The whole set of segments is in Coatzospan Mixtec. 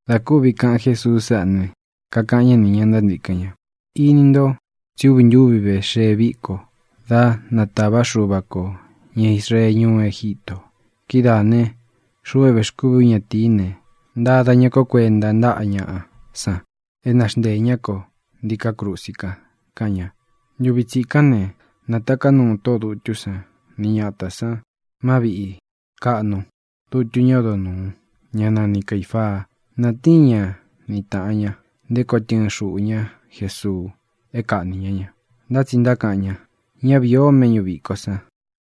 Dā kúvi kāꞌan Jésuu sáꞌā ne, kakaꞌan ñá nī ña ntántīkɨn ña: —Ini nto tsí uvi ntúvi ve xee viko dá nātavá Xuva kō ña Israee ñuú Egítō. Kidáā ne, xuꞌu é vēxkúvī ú ñatīí ne, ntada ñá ko kuenta ntáꞌa ñaꞌa san é naxnteē ñá ko ntiká krusi kan —kaꞌan ña. Ntuvi tsikán ne, nataká nuu tóꞌō dutú san ni ñatā san má viꞌi kāꞌnu dutu ñá odo nūu, ñá nani Caīfaa. Nātíin ña ni tāꞌan ña nté koo tɨɨn xuꞌū ñá Jesuu é kāꞌní ña ña. Ntá tsi ntákaꞌan ña: —Ñá vīi o méꞌñū vikó san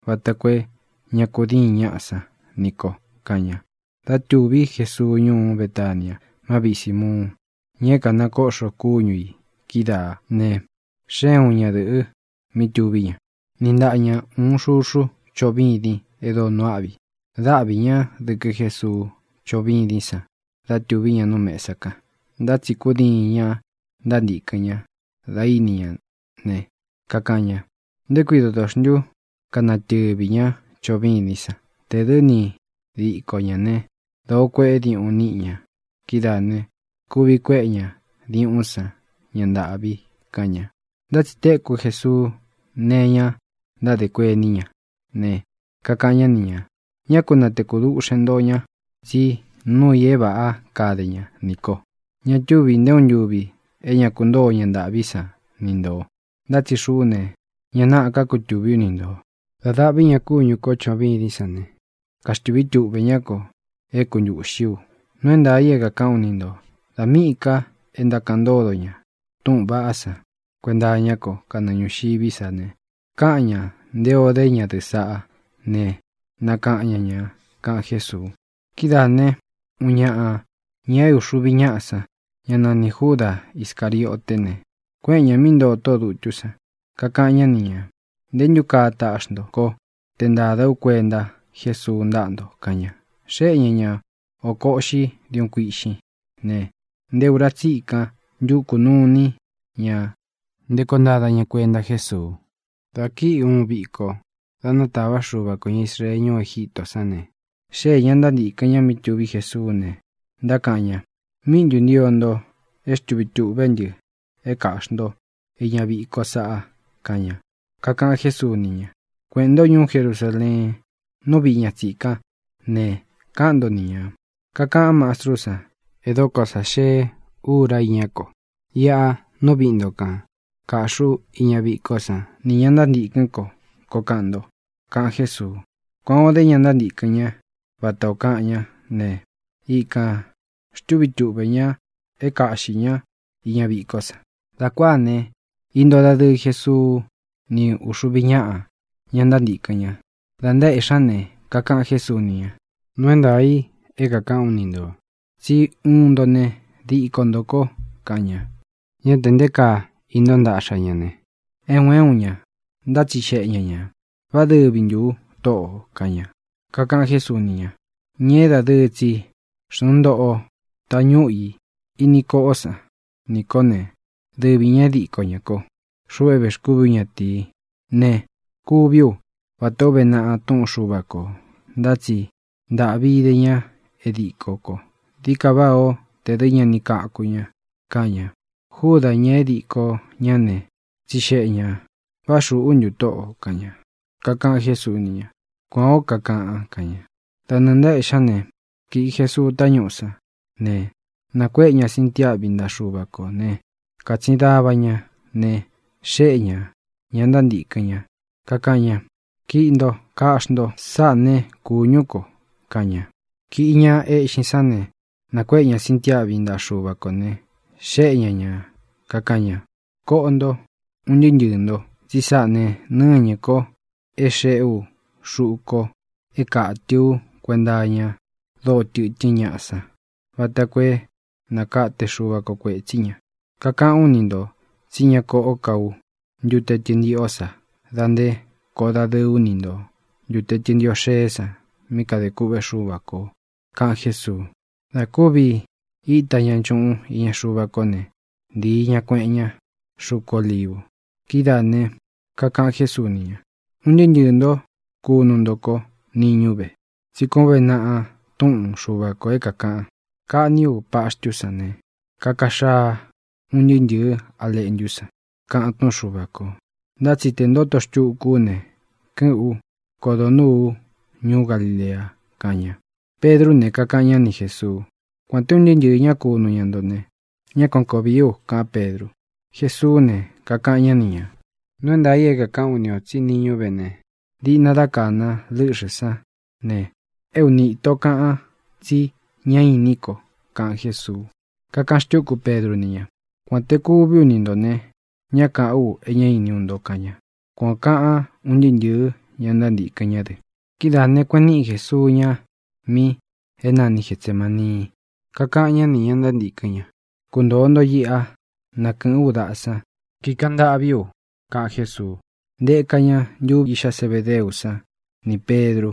vata koo é ña kudíin ñaꞌá san ni kō —kaꞌan ña. Dá tūví Jesuu ñuú Betania, má viꞌi Sīmuun (ña é kānakóꞌxo kúñu ī kídaā) ne, xée uun ñadɨ̄ꞌɨ mí tuví ña, niꞌi ntaꞌa ña ūun xuxu choꞌo vîdin e dóo nuu áꞌvi. Dáꞌvi ña dɨ̄kɨ Jésuu chóꞌo vídin san da túvi ña nú mēsa kan. Ntá tsi kudiin ña ntántīkɨn ña da íni ña ne, kakaꞌan ña: —¿Nté kui doto xntu kanatɨvi ñá choꞌo vîdín san? Tē dɨ́ ni diko ñā né, dōo kueꞌé diuꞌun níꞌi ña. Kidáā ne, kuvi kuéꞌe ña diuꞌún san ñá ntāꞌvi —kaꞌan ña. Ntá tsi tēkú Jesuu nee iña ntádē kuení ña ne, kakaꞌan ñá ni ñā: —Ñá ku natēku duꞌxen ntó ña, tsí nuu i é vāꞌá kade ña nī ko. Ña túvī nté uun ntuvi é ña kuntóo ña ntāꞌví san ni ntō, ntá tsi xuꞌú ne, ñá nāꞌá ka kutuví u ni ntō. Dā daꞌví ña kúñū kó choꞌo vîdín san ne, kaxtūví tuꞌve ñá ko é kuntūꞌxí u. Nuu é ntaā i é kākaꞌán u ni ntō tsí dā míꞌī ká e ntákaꞌan ntódo ña túꞌūn vaꞌá san kuenta iñá ko kanɨɨ ñūxiví sa ne, káꞌan ñāꞌa nté ō dé ñadɨ̄ꞌɨ́ saꞌá ne, nakaꞌan ña ñā —kaꞌan Jésuu. Kidáā ne, uun ñaꞌa ñā é uxuvi ñáꞌa san, ñá nanī Júda Iscārioté ne, kuéꞌen ñā mí ntoo tóꞌō dutú san, kakaꞌan ñá ni ñā: —¿Nté ntu kaa taꞌxi nto kó te ntāda ú kuenta Jésuu ntáꞌa nto? —kaꞌan ña. Xéꞌe ña ña ōko uꞌxí diuꞌun kuiꞌxín ne, nté ūra tsikan ntúkū nuu iní ña nté koo ntada ña kuenta Jésuu. Dā kíi ūun viko da nátava Xuva kō ña Israee ñuú Egítō sán ne, xéē ña ntántīkɨn ña mí tuví Jesuú ne, ntákaꞌan ña: —¿Míꞌi ntū ntio nto é xtūví tuꞌvé ntɨ é kāꞌxi ntó iña vikó sāꞌa? —kaꞌan ña. Kakaꞌan Jésuu ni ña: —Kueꞌēn ntó ñuú Jerusaleen, nú viꞌī ña tsikán ne, káꞌan nto ni ñā: “Kakaꞌan Mástrú san: É dokó sa xee ura iñá ko. Iꞌa nú viꞌi nto kān kaꞌxí u iña vikó san nī ña ntántīkɨ́n ko”, koo kaꞌan nto —kaꞌan Jésuu. Kuan ō dé ña ntántīkɨn ñá vata ō kaꞌan ñá ne, ikan xtūví tuꞌvē ña é kāꞌxi ñá iña vikó san. Dā kuáā ne, íntōo dadɨɨ Jesuu ní uxuvi ñáꞌa, ña ntántīkɨn ña. Da ntaéꞌxi ña ne, kakaꞌan Jésuu ni ña: —Nuu é ntaā i é kākaꞌán u ni ntō, tsí uun nto ne, díko ntō ko —kaꞌan ña. Ñá tē nté kaa íntoo ntaꞌxa ña ne, é un é un ña ntátsixeꞌe ña ñā: —¿Vá dɨvi ntū u, Tóꞌō? —kaꞌan ña. Kakaꞌan Jésuu ni ña: —Ña é dadɨɨ tsi xnuu ntóꞌo tañúꞌu i ini koꞌó san nī kó ne, dɨvi ñā e díko ñá ko. Xuꞌu é vēxkúvī ú ñatīí ne, kuví u vatā ó uve naꞌa túꞌun Xuva kō, ntá tsi ntāꞌvi ide ña é dīkó ko. Dií ka váꞌā ó tē dɨ́ ña ni kaku ña —kaꞌan ña. Júdā, ña é dikō ñá ne, tsixeꞌe ñā: —¿Vá xūꞌú ntu, Tóꞌō? —kaꞌan ña. Kakaꞌan Jésuu ni ña: —Kuān ó kakaꞌan —kaꞌan ña. Da nɨɨ̄ ntaéꞌxī ñá ne, kīꞌi Jesuu tañúꞌū sán ne, nākuéꞌe ña sintiáꞌvi ntaꞌa Xuva kō ne, kátsin dava ña ne, xéꞌe ñā ña ntántīkɨn ñá, kakaꞌan ña: —Kiꞌi ntó, kaꞌxí nto. Sáꞌā ne, kúñū kó —kaꞌan ña. Kīꞌi ña eꞌxin sán ne, nākuéꞌe ña sintiáꞌvi ntaꞌa Xuva kō ne, xéꞌe ña ña, kakaꞌan ña: —Koꞌo nto, un ntɨɨ́ ntɨɨ̄ ntó, tsi sáꞌā ne, nɨ́ñɨ̄ ko é xēꞌé u xuꞌu kó é kātɨ ú kuenta iña dóo tɨtɨ́n ñaꞌa san vata koo é nakate Xuva kō kuetsí ña. Kakaꞌán u ni ntō tsí ña koꞌó ka ú ntute tɨntiꞌó sa dā nté koꞌō dadɨɨ ú ni ntō ntute tɨntiꞌó xēé san mí kadē kûꞌvé Xuva kō —kaꞌan Jésuu. Dā kúvi íta ña nchuꞌun iña Xuva kó ne, ntīi ña, kueꞌen ña xuku Olívu. Kidáā ne, kakaꞌan Jésuu ni ña: —Un ntɨɨ́ ntɨɨ̄ nto kunu nto kó niñú ve. Tsí kuān ó uve naꞌa túꞌun Xuva kō é kākaꞌan: “Kaꞌní u paxtú san ne, kaka xaa un ntɨɨ́ ntɨ̄ɨ́ a leꞌntu san”, kaꞌan túꞌun Xuva kō. Ntá tsi te ntoto xtuku ú ne, kɨ́ꞌɨ̄n ú, kodo nūú u ñuú Galilea —kaꞌan ña. Pedrú ne, kakaꞌan ñá ni Jēsuu —Kuān té un ntɨɨ́ ntɨɨ̄ ñá kunu ña nto ne, ñá kuan koo vīí u —kaꞌán Pedru. Jesuú ne, kakaꞌan ñá ni ñā. —Nuu é ntaā í kakaꞌán u ni ō tsí niñú ve ne, diꞌna dá kāna lɨ́ꞌxɨ̄ sán ne, é uni īto kaꞌan tsí ña inín ko —kaꞌan Jésuu. Kakaꞌan xtúku Pedru ni ña: —Kuān te kuví u ni ntō ne, ñá kāꞌán u e ñá iní u nto —kaꞌan ña. Kuan ō kaꞌan un ntɨɨ́ ntɨ̄ɨ́ ña ntántīkɨn ñá dɨ. Kidáā ne, kueꞌen níꞌi Jēsuu ña mí é nani Getsemānii. Kakaꞌan ñá nī ña ntántīkɨn ña: —Kuntōo nto iꞌa, na kɨ̄ꞌɨ́n u daꞌa san, kikaꞌan ntâꞌví u —kaꞌan Jésuu. Ntēka ña ntuvi íꞌxá Zebedeú san nī Pedru.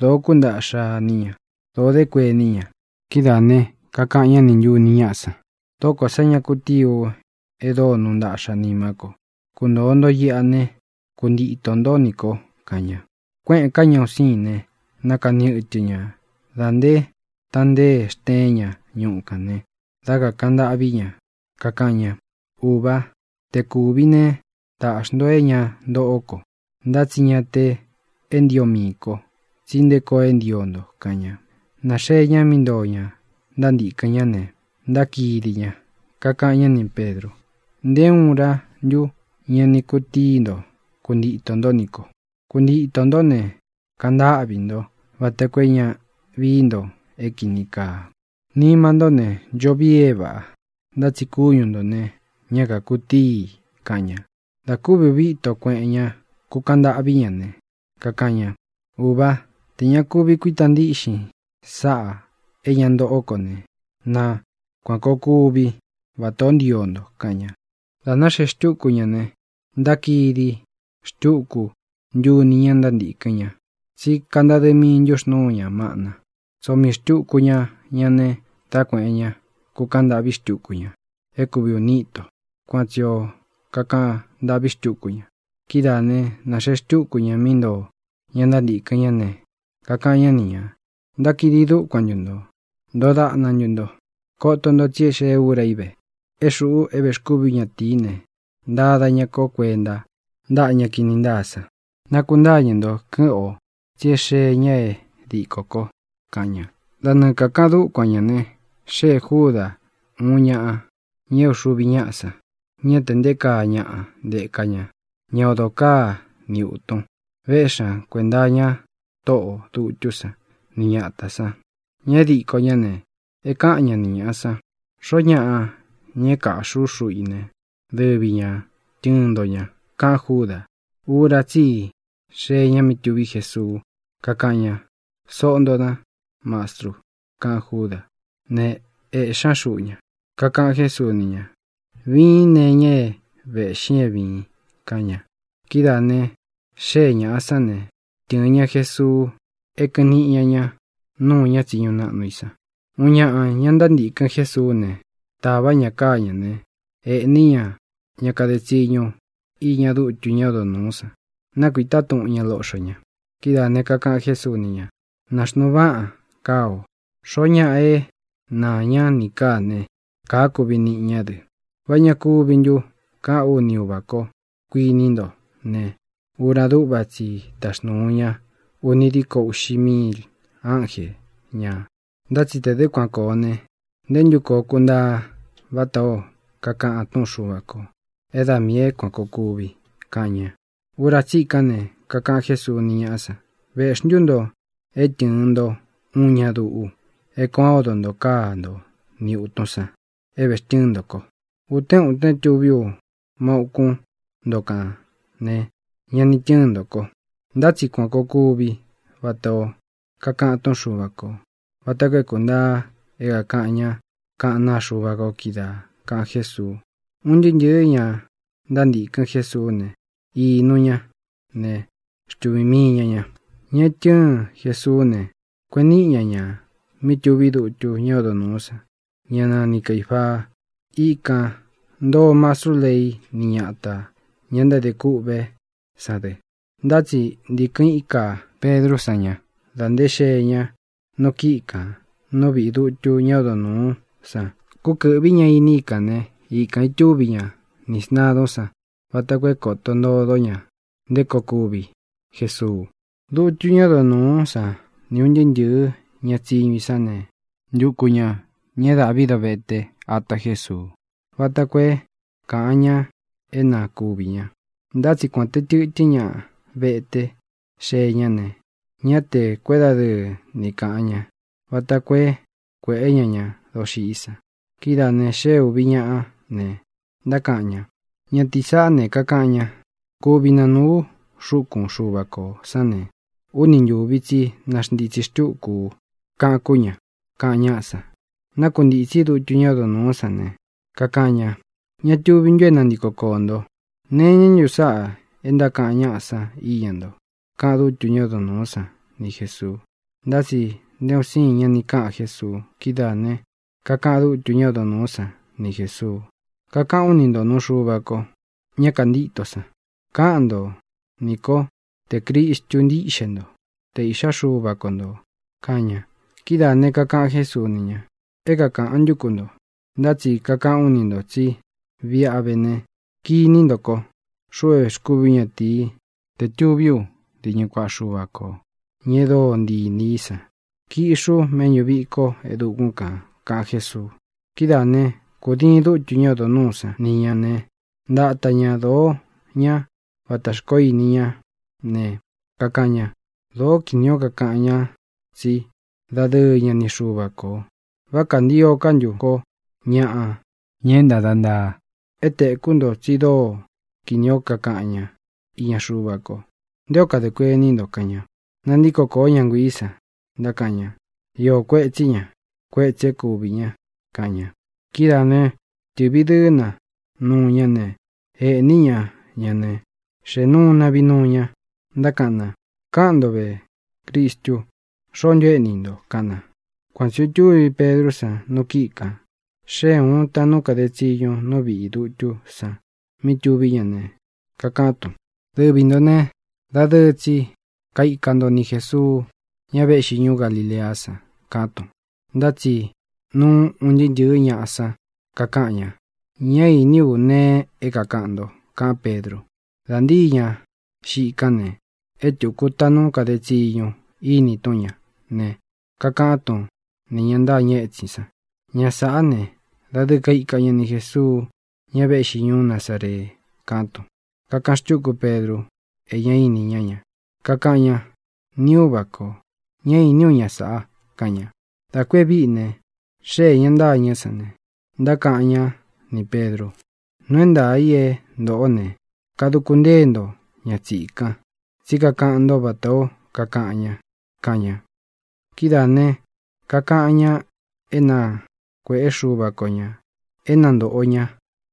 Dōo kúntaꞌxa iní ña. Dōo dé kuení ña. Kidáā ne, kakaꞌan ñá nī ntuni ñáꞌā san: —Dóko sā ña kutií u e dóo nuu ntaꞌxa nimá ko. Kuntōo nto iꞌa ne, kuntitō ntó nī ko —kaꞌan ña. Kuéꞌēn ká ña un sīin ne, nakani ɨtɨ ña da nté tantée xteen ña ñuꞌu kān ne, dá kakāꞌan ntâꞌví ña, kakaꞌan ña: —Ūvá, te kūvi né, tāꞌxi nto é ña ntoꞌó ko. Ntá tsi ña te é ntio mii ko, tsí nté koo é ntio nto —kaꞌan ña. Nāxee ña mí ntoo ña ntántīkɨn ñá ne, ntákidi ña. Kakaꞌan ñá nī Pedru: —¿Nté uun urá ntu ña ni kutii nto kuntito nto nī ko? Kuntito nto ne, kaꞌan ntáꞌvī ntó vata koo é ña vií nto é kīni kaa. Nima ntó ne, ncho vii é vāꞌa, ntá tsi kúñu ntō ne, ñá kākutíi i —kaꞌan ña. Dā kúvi uvi íto kueꞌen ñá kūkaꞌan ntâꞌví ña ne, kakaꞌan ña: —Uva, tē ña kuvi kuíta ntiꞌxin sáꞌā é ña ntoꞌó ko ne, na kuān koo kuví vatā ó ntio nto —kaꞌan ña. Dā náxee xtúku ña ne, ntákidi xtuku ntuni ñá ntántīkɨn ña, tsí kantadɨ́ mii ntuxnūú ña maꞌna. Tsoo mii xtūku ña ña ne, dá kuēꞌen ñá, kukaꞌan ntâꞌví xtuku ña é kūvi uni íto. Kuan tsī o kakaꞌan ntâꞌví xtuku ña. Kidáā ne, naxeé xtuku ña mí ntoo ña ntántīkɨn ñá ne, kakaꞌan ñá ni ñā: —¿Ntákidi dúkuan ntu ntō? ¿Ntoo daꞌna ntu nto? Koto nto tsi e xée ūra í ve é xuꞌu é vēxkúvī ú ñatīí ne, ntada ña ko kuenta ntáꞌa ña kini ntáa san. Nakuntáñɨ̄ nto, kɨ́ꞌɨn ō, tsi é xee ña é dikó ko —kaꞌan ña. Da nɨɨ kākaꞌan dúkuan ñā ne, xéē Júdā, uun ñaꞌa ña é uxuvi ñáꞌa san. Ñá tē nté kaa ñaꞌa ntéka ña, ña odo káa ni ūtun. Véꞌxi ña kuēnta iña tóꞌō dutú san ni ñatā san. Ña é diko ñá ne, é kāꞌan ñá ni ñāꞌa san: —Xoó ñaꞌa, ña é kaꞌxí u xuꞌu i ne, dɨvi ña tɨ̄ɨn nto ña —kaꞌán Júdā. Ura tsí i xee ña mí tuví Jesuu, kakáꞌan ña: —Soꞌo ntō dá, Mastru —kaꞌan Júdā. Ne, ēꞌxí ña xuꞌu ña. Kakaꞌan Jésuu ni ña: —Viín nee iña é vēꞌxin é vīin —kaꞌan ña. Kidáā ne, xée ñāꞌa sán ne, tɨ̄ɨn ña Jesuu é kɨꞌɨn niꞌi ña ñá nuu ña tsiñu naꞌnu i san. Uun ñaꞌa, ña ntántīkɨn Jésuú ne, tāvá ña káa ñā ne, ēꞌní ña ña kade tsiñu iña dutu ñá odo nūú san. Nákuītá tuꞌun ña loꞌxo ña. Kidáā ne, kakaꞌan Jésuu ni ña: —Nāxnuu váꞌan káa o. Xoó ñaꞌa é naā ñá nī káā ne, káā kuvi niꞌi ñá dɨ. ¿Vá ña kuvi ntu káꞌān ú ni Uvā kó, kuiní nto ne, ura dúꞌva tsi i táxnūu ña uni diko uꞌxi míil ánje ñā? Ntá tsi tē dɨ́ kuan kōo ne, ¿nté ntu koo kuntaa vatā ó kakaꞌan túꞌun Xuva kō é da miī é kuān koo kuvi? —kaꞌan ña. Ura tsíkán ne, kakaꞌan Jésuu ni ñáꞌa san: —¿Vēꞌxí ntu nto é tɨ̄ɨn nto uun ña duꞌu, é kuan o odo ntō káa nto ni ūtun san é vēxtɨ́ɨn nto ko? Utén utén tuví u má ūkún nto kān ne, ña ni tɨ́ɨn nto ko. Ntá tsi kuan kōo kuví vatā ó kakaꞌan túꞌun Xuva kō, vata koo é kūntaa é kākaꞌan ñá kaꞌán naa Xuva ko kídaā —kaꞌan Jésuu. Un ntɨɨ́ ntɨ̄ɨ́ ña ntántīkɨn Jésuú ne, inu ña ne, xtuvī mii ña ña. Ña e tɨ́ɨn Jesuú ne, kueꞌen níꞌi ña ña mí tuví dutu ñá odo nūú san, ñá nani Caīfaa. Ikān ntoo mastrú lei ni ñátā, ña ntádē kûꞌvé san dɨ. Ntá tsi ntīkɨn íka Pedrú san ña dá ntē xee ña nu kíꞌi kān nú viꞌī dutu ñá odo nūú san. Kúkɨ̄ꞌví ña iní i kān né, ikān itúvi ña nī sntadún san vata koo é kōto ntodo ña nté koo kuvi Jesuu. Dutu ñá odo nūú san ni ūn ntɨɨ́ ntɨ̄ɨ́ ña tsiñu i sán ne, ntuku ñā ña é dāꞌví dovete ata Jesuu, vata koo é kāꞌan ña é na kuvī ña. Ntá tsi kuān te tɨtɨ́n ña vete xee ña ne, ñá tē kuédadɨɨ ni kāꞌan ñá vata koo é kuēꞌé ña ña doxiꞌí san. Kidáā ne, xée ūvi ñaꞌá ne, ntákaꞌan ña: —Ñatīí saꞌá ne, kakaꞌan ña: “Kuvi nanūu u xúkun Xuva kō sán ne, úni ntūvi tsí naxntītsi xtúku u”, kaꞌan kú ña —kaꞌan ñáꞌa san. Nákuntītsí dutu ñá odo nūú san ne, kakaꞌan ña: —¿Ña tuvi ntu é nantiko koō nto? ¿Nee iñá ntu sáꞌā é ntákaꞌan ñáꞌa san iña nto? —kaꞌan dútu ñá odo nūú san ni Jēsuu. Ntá tsi nte un siin ña ni káꞌan Jésuu. Kidáā ne, kakaꞌan dútu ñá odo nūú san ni Jēsuu: —Kakaꞌán u ni ntō nuu Xuva ko, ña kantíto san, kaꞌan ntó nī kó tē Cristu ntíꞌxe nto, te Īꞌxá Xuva ko ntō —kaꞌan ña. Kidáā ne, kakaꞌan Jésuu ni ña: —É kākaꞌan ntú ku nto. Ntá tsi kakaꞌán u ni ntō tsí viꞌi a vé ne, kiní nto ko, xuꞌu é vēxkúvī ú ñatīi, te tuví u diñɨ kuaꞌa Xuva kō, ña e dóo ntii inī í san. Kiꞌxi ú méꞌñū viko e dukún kān —kaꞌan Jésuu. Kidáā né, kūdiin dútu ñá odo nūú san ni ñā ne, ntata ña dōo ñá vatā xkoó ini ñá ne, kakaꞌan ña: —¡Dōó kinī ó kakaꞌan ña tsí dadɨɨ ña ni Xuva kō! ¿Vá kāntio ká ntu ko ñāꞌa, ña é ntada ntaa? É tekū nto tsi dóo kinī ó kakaꞌan ñá iña Xuva ko. ¿Nté o kadē kuení nto? —kaꞌan ña. Nantíko kōó ña nguiī san, ntákaꞌan ña: —Iō kuetsí ña. Kuétsī é kuvī ña —kaꞌan ña. Kidáā né, tɨ̄ꞌvi dɨɨ́ na nuu ñá ne, ēꞌní ña ña ne, xéꞌē nuu na vinuu ña. Ntákaꞌan na: —Káꞌan ntō ve, Cristu: ¿Xoó ntu éꞌni i nto? —kaꞌan na. Kuan tsi ō itúvi Pedrú san nu kíꞌi kān. Xée ūun taꞌnu kade tsiñu nú viꞌī dutú san mí tuví ña ne, kakaꞌán tun: —Dɨvi ntō né, dadɨɨ tsi kaika nto ni Jēsuu, ña véꞌxi ñuú Galileá san —kaꞌán tun. Ntá tsi núu un ntɨɨ́ ntɨ̄ɨ́ ñaꞌa san kakáꞌan ña: —Ñá īní u nee é kākaꞌan nto —kaꞌán Pedru. Dā ntíi ña xiꞌi kán ne, é tūku taꞌnu kade tsiñu íni tún ña ne, kakaꞌan tún nī ña ntâñɨ étsin san: —Ña sāꞌá ne, dadɨɨ kaika ña ni Jēsuu, ña véꞌxi ñuú Nazaree —kaꞌán tun. Kakaꞌan xtúku Pedru e ñá ini ñá ña. Kakaꞌan ña: —Ni Úva kō, ñá īní u ña sāꞌa —kaꞌan ña. Dā ku e víꞌi ne, xéē ña ntâñɨ́ san ne, ntákaꞌan ñá nī Pedru: —Nuu é ntaā i é ntoꞌo ne, kaduku ntée nto ña tsikan, tsí kakaꞌan ntó vatā ó kakaꞌan ña —kaꞌan ña. Kidáā ne, kakaꞌan ña é na kuēꞌé Xuva ko ñā é na ntōꞌo ñá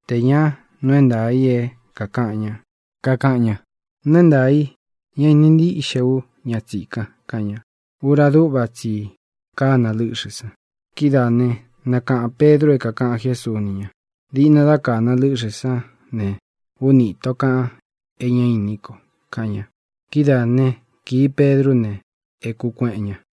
tē ña nuu é ntaā i é kākaꞌan ña. Kakaꞌan ña: —Nuu é ntaā i, ñá īni ntíꞌxe ú ña tsīkan —kaꞌan ña. Ura dúꞌva tsi i kána lɨ́ꞌxɨ̄ san. Kidáā né, nakaꞌān Pedru é kākaꞌan Jésuu ni ña: “Diꞌna dá kāna lɨ́ꞌxɨ̄ sán ne, úni īto kaꞌan e ñá inín ko”, kaꞌan ña. Kidáa ne, kīi Pedrú ne, ēkú kueꞌen ña.